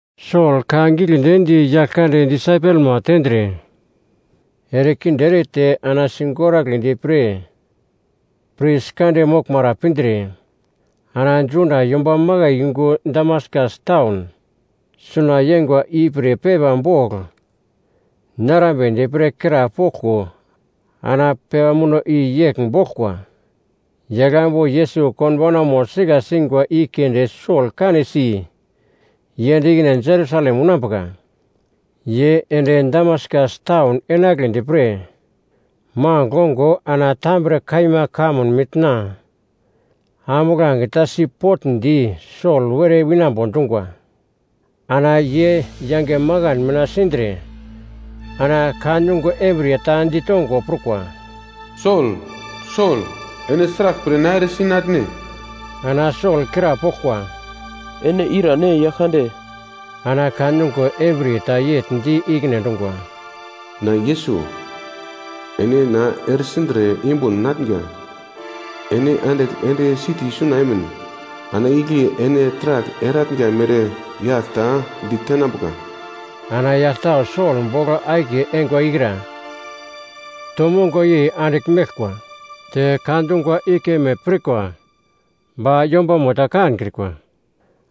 Sol ka giglendi di Yaglkande disaipelma tendre, erekinde erete ana sigoragledi pre pris kande moglmara pindre, ana Juda yomba makai yungu Damaskas taun suna yeingwa ipre pepa bogl narambedi pre krapoglko ana pepa muno i yegl boglkwa, “Yaglambu Yesus konbaunamo sika singwa i keunde Sol kanesi yend ikine Jerusalem unambuka.” Ye ende Damaskas taun enagledi pre magl ongo ana tambre kaima kamun mitna ambuglange ta sipotndi Sol were winambo dungwa. Ana ye yange makan mina sindre ana ka nungo embriye ta ditongo prukwa, “Sol, Sol, ene sraglpre na eresi natne?” Ana Sol krapoglkwa, “Ene irane, Yaglkande?” Ana ka nungo embriye ta yegl di ikine endungwa, “Na Yesus, ene na eresindre yumbun natnga. Ene andigl ende siti suna emin, ana igle ene taragl eratnga mere yagl ta ditenambuka.” Ana yagl tau Sol bogl akiye eingwa ikra to mongo-yei andigl meglkwa, te ka dungwa i keme pirkwa, ba yombamo ta kankrikwa.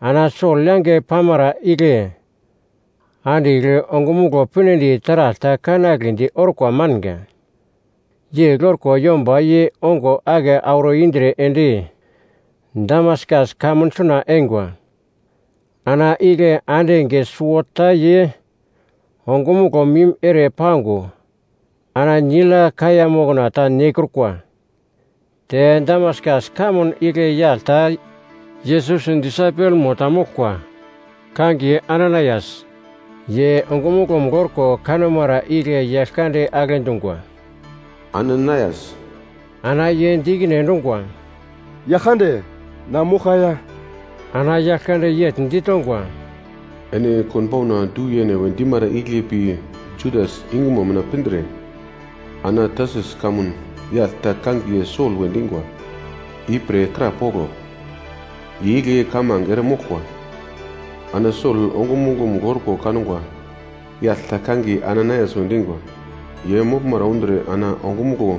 Ana Sol yange pamara igle andigl ongumuglo pinedi taragl ta kanagledi orkwa manga. Yegl orko yomba ye ongo ake auro indre ende Damaskas kamun suna eingwa. Ana igle ande enge suwota ye ongumuglo mim ere pango ana nigl ya kaiya mokna ta nekrukwa. Te Damaskas kamun igle yagl ta Yesus disaipelmo ta moglkwa, kangiye Ananaias. Ye ongumuglo-mugl orko kanumara igle Yaglkande agle dungwa, “Ananaias!” Ana ye di ikine endungwa, “Yaglkande, na moglka ya.” Ana Yaglkande yegl ditongwa, “Ene konbauna ‘Du yene’ we dimara igle pi Judas yungumo mina pindre ana Tarsus kamun yagl ta kangiye Sol we dingwa ipre krapoglo. Ye igle kamange eremoglkwa. Ana Sol ongumuglo-mugl orko kangwa yagl ta kangiye Ananaias we dingwa, ye moglmara undre ana ongumuglo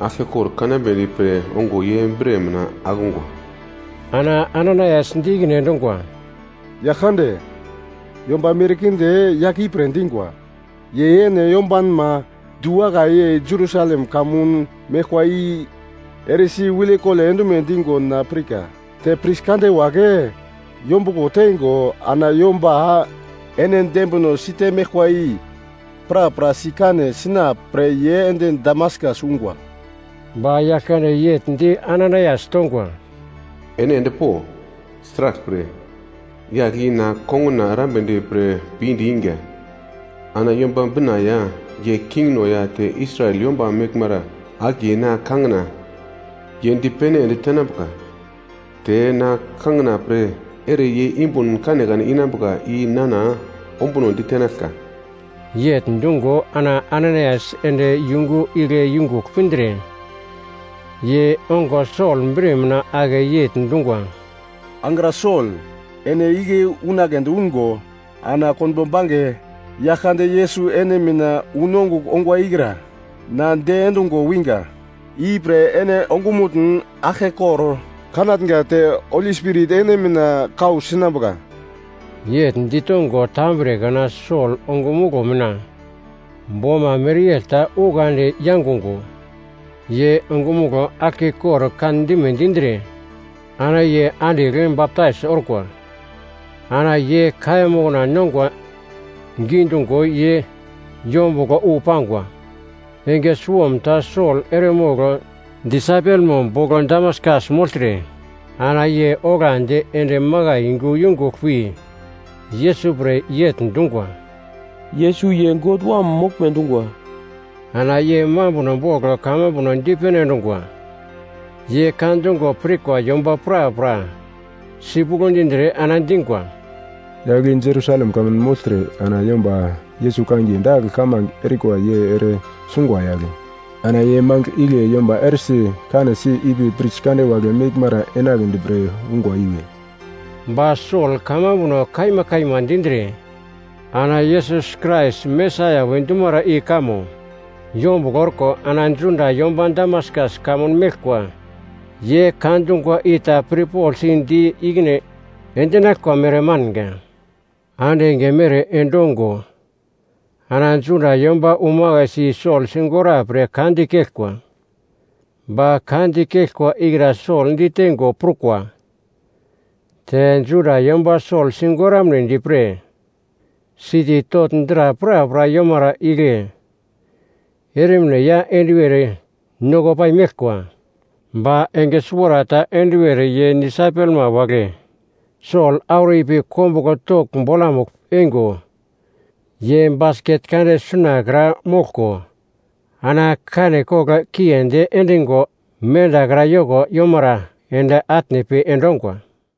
aglkekor kanambedi pre ongo ye bre mina akungwa.” Ana Ananaias di ikine endungwa, “Yaglkande, yomba merkinde yagle ipre dingwa, ye ene yombanma du-wakai Jerusalem kamun meglkwa i eresi wilekole endume dingo na pirka. Te pris kande wagle yombuglo tengo ana yomba ene dembino site meglkwa i prapra sikane sina pre ye ende Damaskas ungwa.” Ba Yaglkande yegl di Ananaias tongwa, “Ene endpo! Sraglpre, yagl i na konguna erambedi pre pinde inga. Ana Yomba Bina ya ye kingno ya te Israel yomba meglmara akiye na kangina ye dipene ende tenambuka. Te na kangina pre ere ye yumbun kanekane inambuka i nana ombuno ditenaglka.” Yegl dungo ana Ananaias ende yungu igle yungugl pindre ye ongo Sol bre mina ake yegl dungwa, “Angra Sol, ene igle unagledi ungo ana konbo bange Yaglkande Yesus ene mina unongugl ongwa ikra, na diendungo winga, ipre ene ongumutn aglkekor kanatnga te Holi Spirit ene mina kau sinambuka.” Yegl ditongo tambre kana Sol ongumuglo mina boma mereyegl ta ukandi yangungo, ye ongumuglo aglkekor kandime dindre ana ye andigl baptais orkwa. Ana ye kaiya mokna nongwa gidungo ye yombuglo wu pangwa. Enge suwomta Sol eremogl disaipelmo bogl Damaskas mogltre, ana ye oglandi ende makai yungu yungugl pi Yesus pre yegl dungwa, “Yesus, ye God Wam moglme dungwa.” Ana ye mambuno bogl kamambuno dipene endungwa. Ye ka dungo pirkwa yomba prapra sipuglo dindre ana dingwa, “Yagl i Jerusalem kamun mogltre ana yomba Yesus kangiye dagl kamange erikwa ye ere sungwa yagle. Ana ye mangigl igle yomba eresi kanesi ipi pris kande wagle meglmara enagledi pre ungwa iwe.” Ba Sol kamambuno kaima kaima dindre ana Yesus Krais Mesaia we dumara i kamo yombuglo orko ana Juda yomba Damaskas kamun meglkwa, ye ka dungwa i ta pirpoglsi di ikine endinaglkwa mere manga. Ande enge mere endongo ana Juda yomba umakaisi Sol sigora pre ka dikeglkwa. Ba ka dikeglkwa ikra Sol ditengo prukwa. Te Juda yomba Sol sigoramnedi pre siti togl dra prapra yomara igle ermine ya enduwer noko pai meglkwa. Ba enge suwarata enduwer ye disaipelma wagle Sol auro ipi kombuglo togl bolamugl eingo, ye basket kande sunakra moglko ana kane kogl kiendi endingo mendakra yoko yomara ende atne pi endongwa.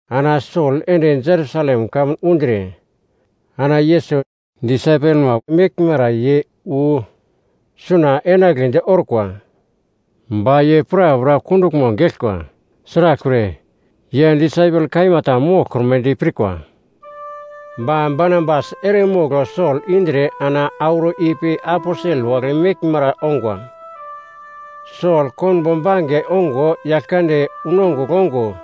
Ana Sol ende Jerusalem kamun undre ana Yesus disaipelma meglmara ye wu suna enagledi orkwa. Ba ye prapra kunduglmo geglkwa, sraglpre, ye disaipel kaima ta moglkrumedi pirkwa. Ba Barnabas eremogl Sol indre ana auro ipi aposel wagle meglmara ongwa. Sol konbo bange ongo Yaglkande unongugl ongo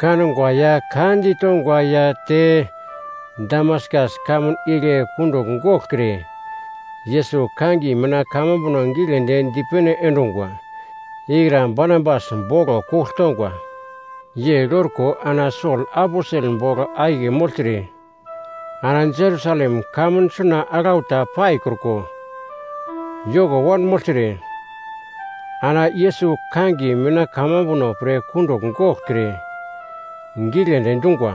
kangwa ya ka ditongwa ya te Damaskas kamun igle kundugl goglkre Yesus kangiye mina kamambuno giglendi dipene endungwa ikra Barnabas boglo kugl tongwa. Yegl orko ana Sol aposel bogl akiye mogltre ana Jerusalem kamun suna aglau ta paikruko yoko wanmogltre, ana Yesus kangiye mina kamambuno pre kundugl goglkre giglendi dungwa.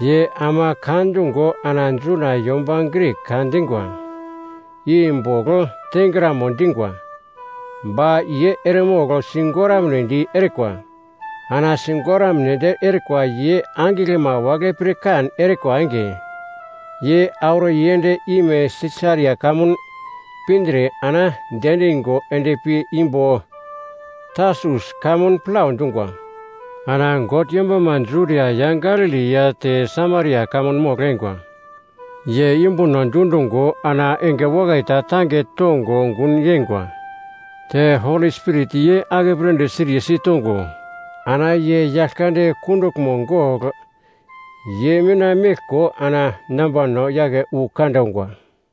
Ye ama ka dungo ana Juda yomba Grik ka dingwa i bogl tengramo dingwa. Ba ye eremogl sigoramnedi erikwa. Ana sigoramnedi erikwa ye angiglma wagle pirkan erikwa enge, ye auro yend ime Sisaria kamun pindre ana diendingo endpi imbo Tarsus kamun plau dungwa. Ana God yombama Judia ya Galili ya te Samaria kamun mogl-eingwa ye yumbuno dundungo ana enge wakai ta tange tongo gun yengwa. Te Holi Spirit ye akepledi siriye sitongo ana ye Yaglkande kunduglmo gogl ye mina meglko ana nambano yake wu kande ongwa.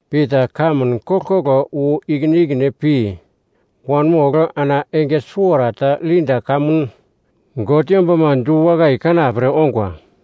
Pita kamun koglkoglo wu ikine ikine pi wanmogl ana enge suwarata Lida kamun God yombama du-wakai i kanapre ongwa.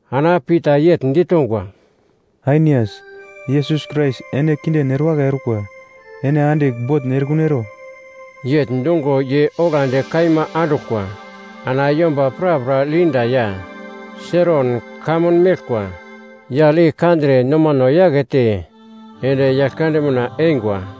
Ana Pita yegl ditongwa, “Ainias, Yesus Krais ene kinden erewakai orkwa, ene andigl botn erekun ero.” Yegl dungo ye oglandi kaima anduglkwa. Ana yomba prapra Lida ya Seron kamun meglkwa yagl i kandre nomano yakete ende Yaglkande mina eingwa.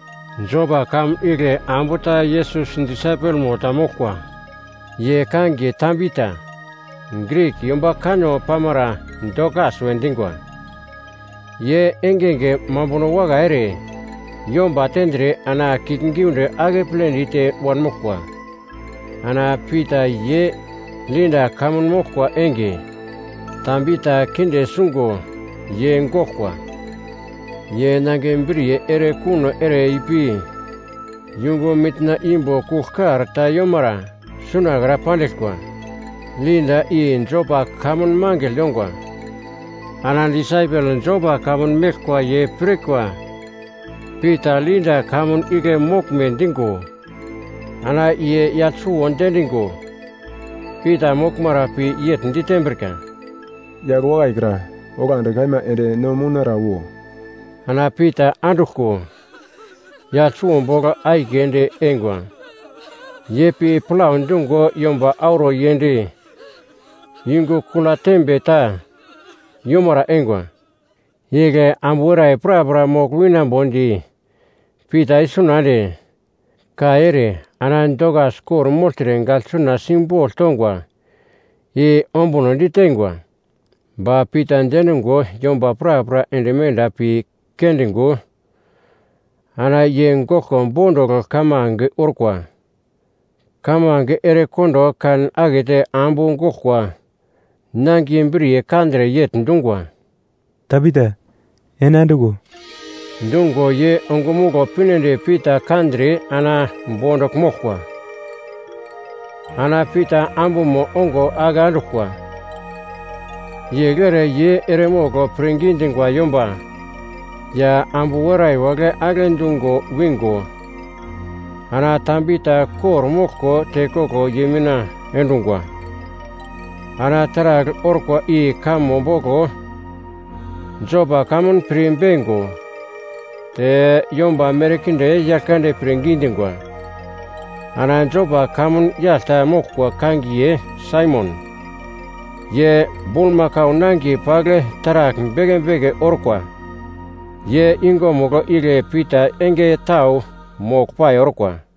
Jopa kamun igle ambu ta Yesus disaipelmo ta moglkwa, ye kangiye Tabita (Grik yomba kanno pamara Dokas we dingwa). Ye engenge mambuno wakai ere yomba tendre ana kiuglgiunde akeple dite wanmoglkwa. Ana Pita ye Lida kamun moglkwa enge Tabita kinde sungo ye goglkwa. Ye nangiye briye ere kuno ere ipi yungu mitna imbo kuglkar ta yomara sunakra pandiglkwa. Lida i Jopa kamun mangigl yongwa. Ana disaipel Jopa kamun meglkwa ye pirkwa Pita Lida kamun igle moglme dingo, ana ye yagl suwo diendingo Pita moglmara pi yegl ditembrika, “Yagl wakai kra, oglandi kaima ende no mounara wo!” Ana Pita anduglko yagl suwo bogl akiye ende eingwa. Ye pi plau dungo yomba auro yend yungu kula tembe ta yomara eingwa. Igle ambu werai prapra mogl winambodi Pita isuna ende, kai ere ana Dokas kor-mogltre gaglsuna simbogl tongwa i ombunodi teingwa. Ba Pita diendungo yomba prapra ende menda pi kendingo ana ye goglko bondugl kamange orkwa. Kamange erekondo kan akete ambu goglkwa nangiye briye kandre yegl dungwa, “Tabita, ene anduglo!” Dungo ye ongumuglo pinedi Pita kandre ana bondugl moglkwa. Ana Pita ambumo ongo ake anduglkwa. Yegl ere ye eremogl pirngi dingwa yomba ya ambu werai wagle agle dungo wingo, ana Tabita kor-moglko tekoglo ye mina endungwa. Ana taragl orkwa i kamo boglo Jopa kamun pir beingo te yomba merkinde Yaglkande pirngi dingwa. Ana Jopa kamun yagl ta moglkwa kangiye Saimon, ye bulmakau nangiye pagl taragl beke beke orkwa, ye yungumugl igle Pita enge tau moglpai orkwa.